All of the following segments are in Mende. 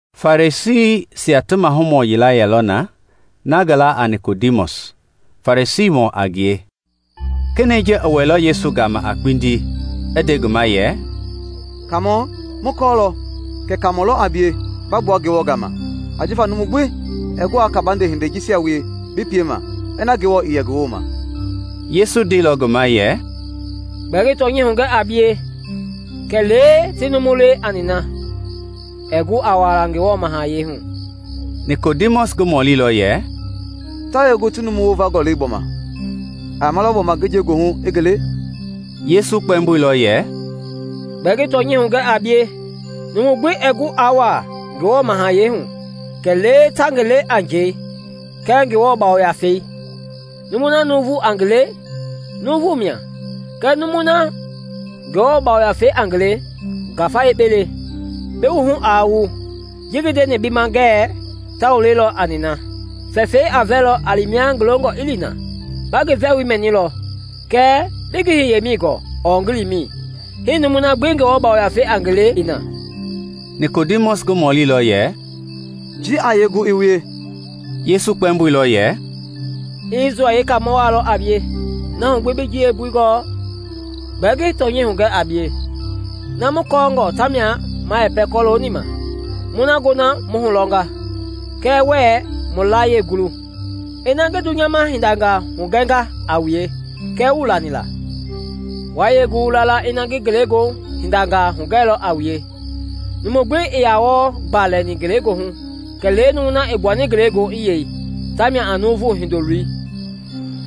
Farisiisia ti mahumɔ yila yɛlɔ na, ngi laa a Nikodimɔsi, Farisiimɔ a ngie. Kenɛi ji i wɛilɔ Yesu gama a kpindi i nde ngi ma yɛ, “Kaamɔ, mu kɔɔlɔ kɛ Kaamɔ lɔ a bie ba gbua Ngewɔ gama; ajifa numu gbi ɛɛ gu aa kabande hindei jisia wie bi piema ina Ngewɔ i yɛ ngi wooma.” Yesu ndeilɔ ngi ma yɛ, “Gbɛɛ ngi tɔnyɛi hugɛ a bie, kɛlee ti numu le a nina, ɛɛ gu a wuaala Ngewɔ mahayɛi hu.” Nikodimɔsi i ngi mɔlilɔ yɛ, “Ta yee gu ti numu wovangɔ le gbɔma? A yamalɔ gbɔma ngi nje goohu i ngi le?” Yesu kpɛmboilɔ yɛ, “Gbɛɛ ngi tɔnyɛi hugɛ a bie, numu gbi ɛɛ gu aa wuaa Ngewɔ mahayɛi hu kɛlee ta ngi le a njɛi kɛɛ Ngewɔ Yafei. Numui na nuuvu a ngi le, nuuvu mia kɛɛ numui na Ngewɔ Yafei a ngi le ngafa le. Bi wuhu aa wu ji ngi ndeni bi ma ngɛɛ, ‘ta wu le lɔ a nina.’ Fɛfɛi a vɛlɔ a li mia ngi longɔ i li na; ba ngi vɛwoi mɛnilɔ kɛɛ bii ngi hiyemɛi gɔɔ ɔɔ ngi limɛi; hii numui na gbi Ngewɔ Yafei a ngi le i na.” Nikodimɔsi i ngi mɔlilɔ yɛ, “Ji a yee gu i wie?” Yesu i kpɛmboilɔ yɛ, “Isrɛl yeekaamɔ waa lɔ a bie, na hu gbi bii ji yeembui gɔɔ? Gbɛɛ ngi tɔnyɛi hugɛ a bie, na mu kɔɔngɔ ta mia ma yɛpɛ kɔlooni ma, mu na gona mu hulɔnga, kɛɛ wuɛɛ mu layie gulu. Ina ngi dunyama hindangaa hugɛnga a wue kɛɛ wuii lani la, wa yee gu wu la la ina ngi ngelegoohu hindangaa hugɛilɔ a wue? Numu gbi ii yaa wɔɔ gba lɛni ngelegoohu kɛlee numui na i gbuani ngele goohu i yei, tamia a Nuuvu Hindoloi.”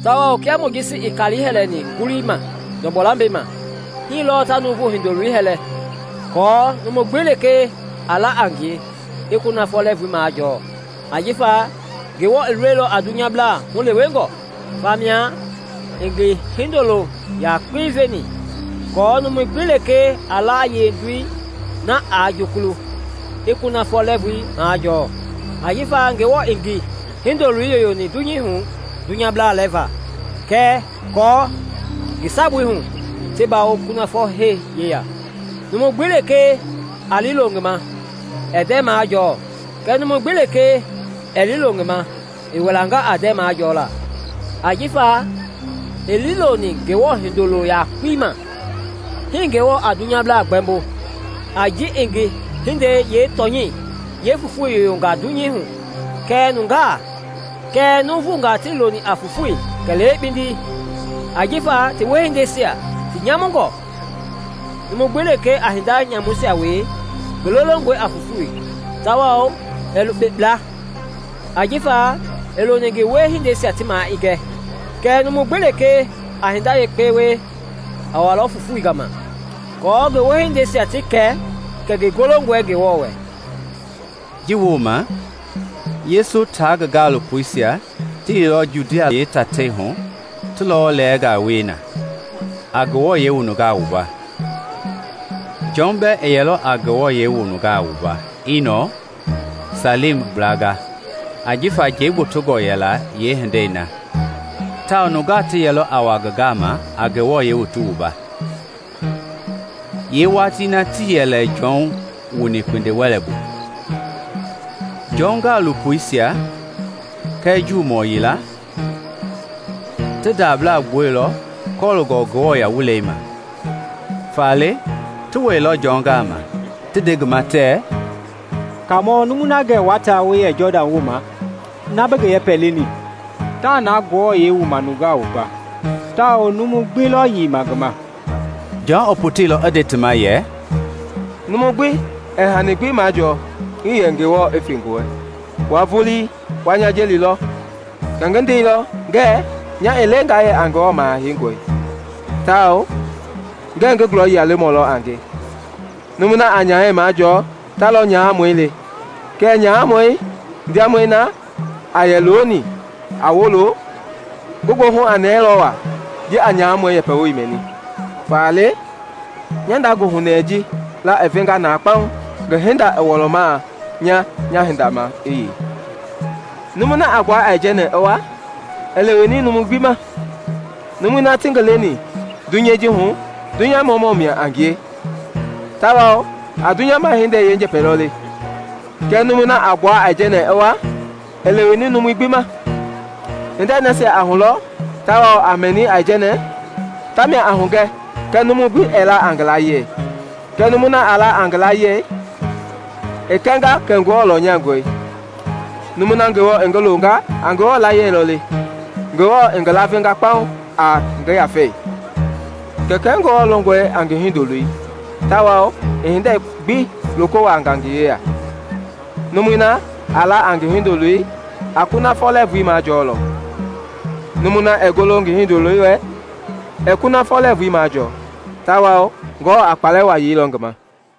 Tawao kia Mojisi i kalii hɛlɛni ngulii ma ndɔgbɔ lambɛi ma, hii lɔɔ ta Nuuvu Hindoloi hɛlɛ, aako numu gbi lekee a la a ngie i kunafɔ lɛɛvui majɔɔ. Ajifa Ngewɔ i loilɔ a dunyablaa hulewengɔ, famia i ngi Hindolo yakpei veni aako numu gbi lekee a la a yee-Ndoi na aa jukulu, i kunafɔ lɛɛvui majɔɔ. Ajifa Ngewɔ ii ngi Hindoloi yoyoni dunyei hu dunyablaa lɛɛva kɛɛ aako ngi sabui hu ti bawo kunafɔ hee yeya. Numu gbi lekee a liilo ngi ma ɛɛ ndɛɛ majɔɔ kɛɛ numu gbi lekee ɛɛ liilo ngi ma, i wilanga a ndɛɛ majɔɔla ajifa ii liiloni Ngewɔ Hindoloo yakpei ma. Hii Ngewɔ a dunyablaa gbɛmbo, a ji i ngi hindei yeetɔnyɛi yeefofoi yoyonga dunyei hu kɛɛ nuuvungaa tii loni a fofoi kɛlee kpindi ajifa ti wiehindeisia ti nyamungɔ. Numu gbi lekee a hinda nyamuisia wie, ngi lolongɔe a fofoi tawao ɛɛ lukpe kpla, ajifa ii loni ngi wiehindeisia ti maa i gɛ. Kɛɛ numu gbi lekee a hinda yekpe wie, a walɔ fofoi gama aako ngi wiehindeisia ti kɛ kɛ ngi golongɔe Ngewɔ wɛ. Ji wooma, Yesu tia ngi gaalopoisia ti liilɔ Judia yeetatei hu ti lɔwɔ lɛɛnga wie na, a nungaa wua. Jɔn bɛɛ i yɛlɔ a nungaa wua Iinɔn, Salim gblanga, ajifa njɛi gbotongɔ yɛla yeehindei na, tawao nungaa ti yɛlɔ a wa ngi gama a ti wua. (Yeewatii na tii yɛ lɛ Jɔn wuni kpindi-wɛlei bu.) Jɔn gaalopoisia kɛɛ Juumɔ yila ti ndablaa wieilɔ kɔlooni nguɛi ma. Faale ti wɛilɔ Jɔn gama ti nde ngi ma tɛɛ, “Kaamɔ, numui na gɛ wua ta wu yɛ Jɔdan wooma, na bi ngi yɛpɛ leni, taa na nungaa wuama tawao numui gbi lɔ yeima ngi ma.” Jɔn i poteilɔ i nde ti ma yɛ, “Numu gbi ɛɛ hani gbi majɔɔ iiyɛ Ngewɔ i fe ngi wɛ. Wua vulii wa nya jelilɔ kɛ ngi ndeilɔ ngɛɛ nya ii le nga yɛ a Ngewɔ Maha Heingɔi, tawao ngɛɛ ngi gulɔyia lemɔ lɔ a nge. Numui na a nyahɛi majɔɔ ta lɔ nyahamɔi le; kɛɛ nyahamɔi ndiamɔi na a yɛ looni a wolo, ngi goohu a nɛɛlɔ waa ji a nyahamɔi yɛpɛ woi mɛni. Faale nya nda goohunɛɛi ji laa i venga na kpaŋ. Ngi hinda i wɔlɔmaa, nya nya hinda maa i yei.” Numui na a gbua aijɛnɛ i wa, i leweni numui gbi ma. Numui na ti ngi leni dunyei ji hu dunyamamɔ mia a ngie tawao a dunyama hindei yeenjɛpɛ lɔ le; kɛɛ numui na a gbua aijɛnɛ i wa, i leweni numu gbi ma. Hindei nasia a hulɔ tawao a mɛni aijɛnɛ, tamia a hugɛ kɛɛ numu gbi ɛɛ la a ngi layie. Kɛɛ numui na a la a ngi layie, i kɛnga kɛ Ngewɔ lɔnyangɔe. Numui na Ngewɔ i ngi loonga a Ngewɔ layie lɔ le, Ngewɔ i ngi lavenga kpaŋ a ngi Yafei. Kɛkɛi Ngewɔ longɔe a ngi Hindoloi tawao i hindei gbi loko wuaanga ngi yeya. Numui na a la a Hindoloi a kunafɔ lɛɛvui majɔɔlɔ; numui na ɛɛ golo Hindoloi wɛ, ɛɛ kunafɔ lɛɛvui majɔɔ tawao Ngewɔ a kpalɛ waa yeilɔ ngi ma.